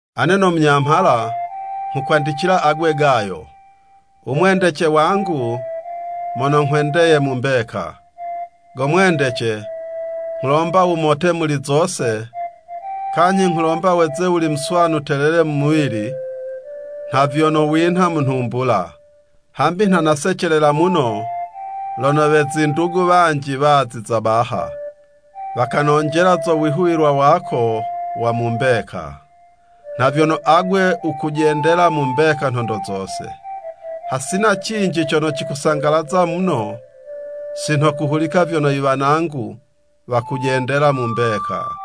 Ane no munyamhala, nghukwandicila agwe Gayo, u mwendece wangu, mono nghwendeye mu mbeka. Go mwendece, nghulomba wumote muli zose, kanyhi nghulomba weze wuli muswanu telele mu muwili, nha vyono winha mu nhumbula. Hambi nha nasecelela muno lono we zindugu wanji waziza baha, wakanonjela zo wihuwilwa wako wa mu mbeka, nha vyono agwe wukujendela mu mbeka nhondo zose. Hasina cinji cono cikusangalaza muno, si nho kuhulika vyono i wanangu wakujendela mu mbeka.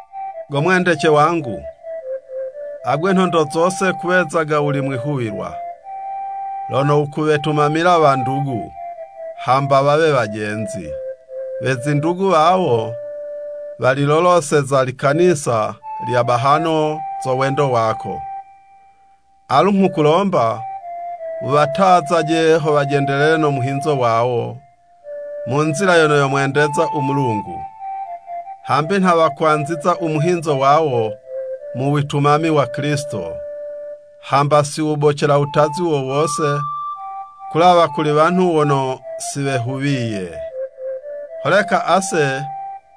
Go mwendece wangu, agwe nhondo zose kuwezaga wuli mwihuwilwa lono wukuwetumamila wandugu, hamba wawe wajenzi. We zindugu wawo, waliloloseza likanisa lya bahano zo wendo wako. Alu nghukulomba, wuwatazaje ho wajendelele no muhinzo wawo, mu nzila yono yomwendeza u Mulungu. Hambi nha wakwanziza u muhinzo wawo mu witumami wa Kilisito, hamba si wobecela wutazi wo wose kulawa kuli wanhu wono si wehuwiye. Holeka ase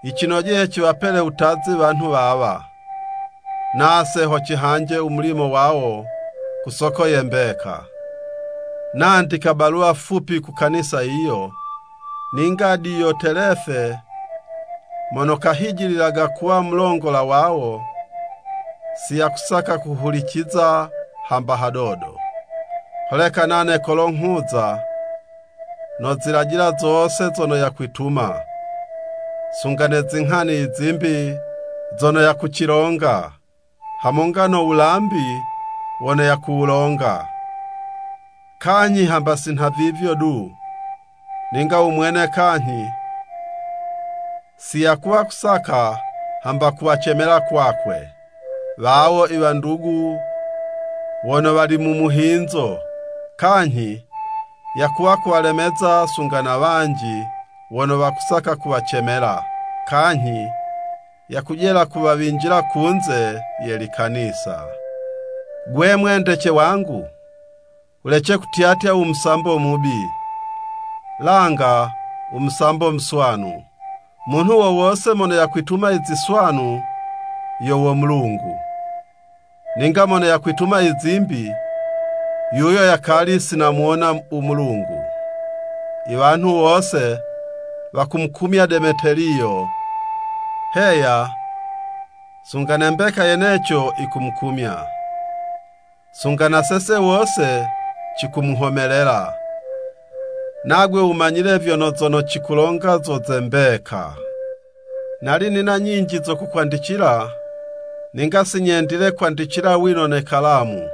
yicinojeye ciwapele wutazi wanhu wawa, nase ho cihanje u mulimo wawo ku soko ye mbeka. Nandika baluwa fupi ku kanisa yiyo, ninga Diyotelefe mono kahijililaga kuwa mulongola wawo, si yakusaka kuhuliciza hamba hadodo. Holeka nane kolo nghuza, nozilajila zose zono yakwituma, sunga ne zinghani i zimbi zono yakucilonga, hamonga no wulambi wono yakuwulonga. Kanyhi hamba si nhavivyo du, ninga u mwene kanyhi, si yakuwa kusaka hamba kuwacemela kwakwe, wawo i wandugu wono wali mu muhinzo, kanyhi yakuwa kuwalemeza sunga na wanji wono wakusaka kuwacemela, kanyhi yakujela kuwawinjila kunze ye likanisa. Gwe mwendece wangu, wulece kutyatya u musambo mubi, langa u musambo muswanu. Munhu wo wose mono yakwituma i ziswanu, yo wo Mulungu, ninga mono yakwituma i zimbi, yuyo yakali si namuwona u Mulungu. I wanhu wose wakumukumya Demeteliyo, heya, sunga ne mbeka yeneco yikumukumya. Sunga na sese wose cikumuhomelela, nagwe wumanyile vyono zono cikulonga zo ze mbeka. Nali nina nyinji zo kukwandicila, ninga si nyendile kwandicila wino ne kalamu.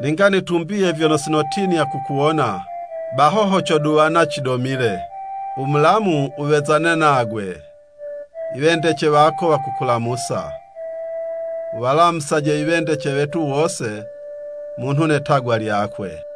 Ninga nitumbiye vyono si notinya kukuwona, baho ho coduwana cidomile. U mulamu wuwezane nagwe. I wendece wako wakukulamusa. Wuwalamusaje i wendece wetu wose munhu ne 'tagwa lyakwe.